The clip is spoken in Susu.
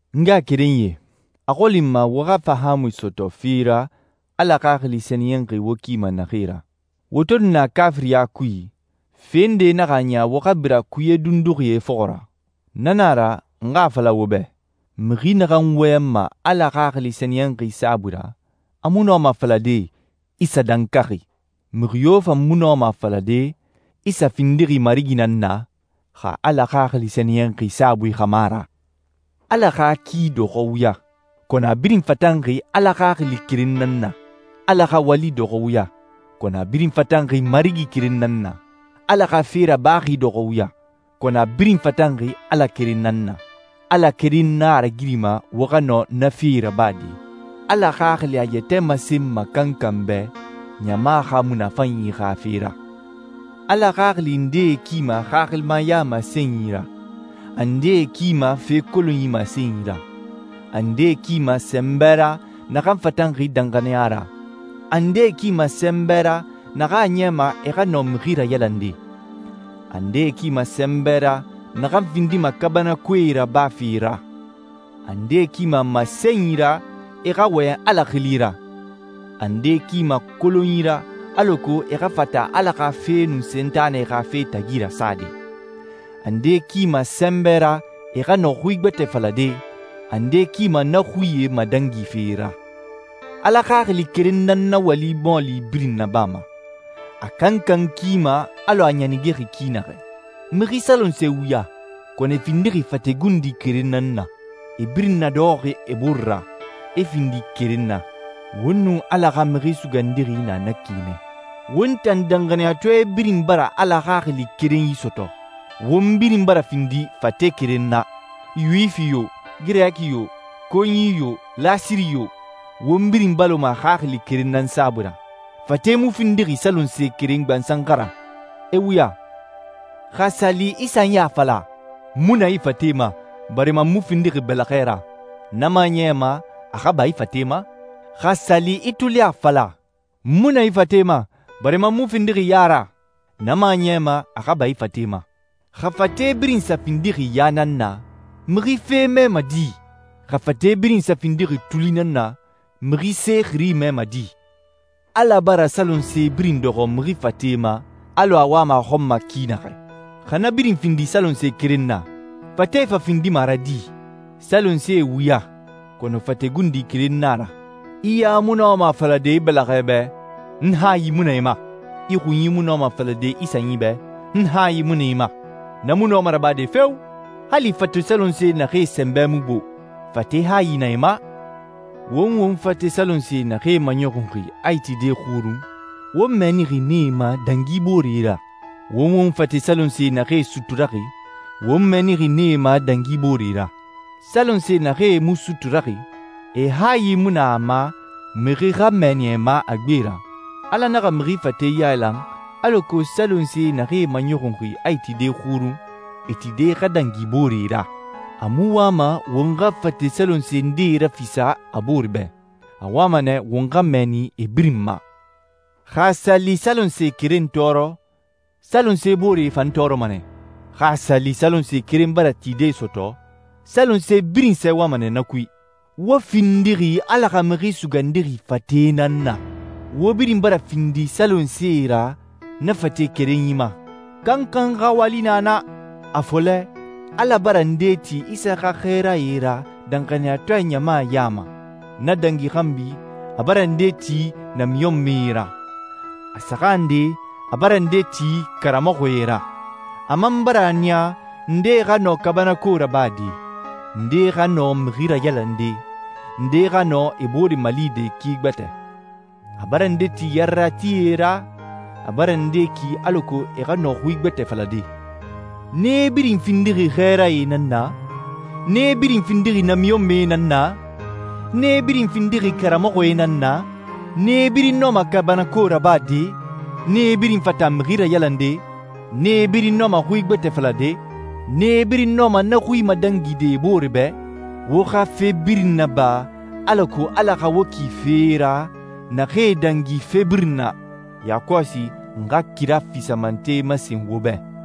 N ngaxakerenyie, a xɔli n ma wo xa fahaamui sɔtɔ fee ra Ala Xaxili Sɛniyɛnxi wo kima naxee ra. Wo to nu na kaafiriɲa kui, fe nde naxa a niya wo xa bira kuye dunduxie fɔxɔ ra. Na na a ra, n xa a fala wo bɛ, mixi naxan wɔyɛnma Ala Xaxili Sɛniyɛnxi saabui ra, a mu nɔma a falade, «Isa dankaxi.» Mixi yo fan mu nɔma a falade, «Isa findixi Marigi nan na,» xa Ala Xaxili Sɛniyɛnxi saabui xa mu a ra. Ala xa ki dɔxɔɛ wuya, kɔnɔ a birin fatanxi Ala Xaxili keren nan na. Ala xa wali dɔxɔɛ wuya, kɔnɔ a birin fatanxi Marigi keren nan na. Ala xa fe rabaxi dɔxɔɛ wuya, kɔnɔ a birin fatanxi Ala keren nan na. Ala keren nan a ragirima wo xa nɔ na fee rabade. Ala Xaxili a yɛtɛ masenma kankan bɛ ɲama xa munafanyi xa fe ra. Ala Xaxili ndee kima xaxilimaya masenyi ra, a ndee kima fe kolonyi masenyi ra, a ndee kima sɛnbɛ ra naxan fatanxi danxaniya ra, a ndee kima sɛnbɛ ra naxan a niyama e xa nɔ mixi rayalande, a ndee kima sɛnbɛ ra naxan findima kaabanakoe rabafe ra, a ndee kima masenyi ra e xa wɔyɛn Ala xili ra, a ndee kima kolonyi ra alako e xa fata Ala xa fe nun Sentanɛ xa fe tagi rasade, a ndee kima sɛnbɛ ra e xa nɔ xui gbɛtɛe falade, a ndee kima na xuie madangife ra. Ala Xaxili keren nan na wali mɔɔli birin nabama. A kankan kima alɔ a a ɲanigexi ki naxɛ. Mixi salonsee wuya, kɔnɔ e findixi fate gundi keren nan na. E birin nadɔxɔxi e bore ra, e findi keren na. Won nun Ala xa Mixi Sugandixi na na ki nɛ. Won tan danxaniyatɔɛ birin bara Ala Xaxili kerenyi sɔtɔ. Won birin bara findi fate keren na. Yuwifi yo, Girɛki yo, konyi yo, lasiri yo, won birin baloma Xaxili keren nan saabui ra. Fate mu findixi salonse keren gbansan xa ra, e wuya. Xa a sa li i sanyi a fala, «N mu na i fate ma, barima n mu findixi bɛlɛxɛ ra,» na mu a niyama a xa ba i fate ma. Xa a sa li i tuli a fala, «N mu na i fate ma, barima n mu findixi ya ra,» na mu a niyama a xa ba i fate ma. Xa fate birin sa findixi ya nan na, mixi fe mɛma di? Xa fate birin sa findixi tuli nan na, mixi se xiri mɛma di? Ala bara salonse birin dɔxɔ mixi fate ma, alɔ a wama a xɔn ma ki naxɛ. Xa na birin findi salonse keren na, fate fa findima a ra di? Salonsee wuya, kɔnɔ fate gundi keren na a ra. I ya mu nɔma a falade i bɛlɛxɛ bɛ, «N hayi mu na i ma.» I xunyi mu nɔma a falade i sanyi bɛ, «N hayi mu na i ma.» Na mu nɔma rabade feo! Hali fate salonse naxee sɛnbɛ mu gbo, fate hayi na e ma. Won won fate salonse naxee maɲɔxunxi a e tide xurun, won mɛɛnixi nee ma dangi booree ra. Won won fate salonse naxee suturaxi, won mɛɛnixi nee ma dangi booree ra. Salonse naxee mu suturaxi, e hayi mu na a ma mixi xa mɛnni e ma a gbe ra. Ala naxa mixi fate yailan alako salonse naxee maɲɔxunxi a e tide xurun, e tide xa dangi booree ra. A mu wama won xa fate salonse nde rafisa a boore bɛ. A wama nɛ won xa mɛɛni e birin ma. Xa a sa li salonse keren tɔɔrɔ, salonse booree fan tɔɔrɔma nɛ. Xa a sa li salonse keren bara tide sɔtɔ, salonse birin sɛɛwama nɛ na kui. Wo findixi Ala xa Mixi Sugandixi fate nan na. Wo birin bara findi salonsee ra na fate kerenyi ma. Kankan xa wali na na. A fɔlɛ, Ala bara ndee ti Isa xa xɛɛrae ra danxaniyatɔɛ ɲama ya ma. Na dangi xanbi, a bara ndee ti namiɲɔnmɛe ra. A saxan nde, a bara ndee ti karamɔxɔe ra. A man bara a niya ndee xa nɔ kaabanako rabade, ndee xa nɔ mixi rayalande, ndee xa nɔ e booree malide ki gbɛtɛ. A bara ndee ti yareratie ra, a bara ndee ki alako e xa nɔ xui gbɛtɛe falade. Nee birin findixi xɛɛrae nan na? Nee birin findixi namiɲɔnmɛe nan na? Nee birin findixi karamɔxɔe nan na? Nee birin nɔma kaabanako rabade? Nee birin fata mixi rayalande? Nee birin nɔma xui gbɛtɛe falade? Nee birin nɔma na xuie madangide e booree bɛ? Wo xa fe birin naba alako Ala xa wo ki fee ra naxee dangi fe birin na. Yakɔsi n xa kira fisamante masen wo bɛ.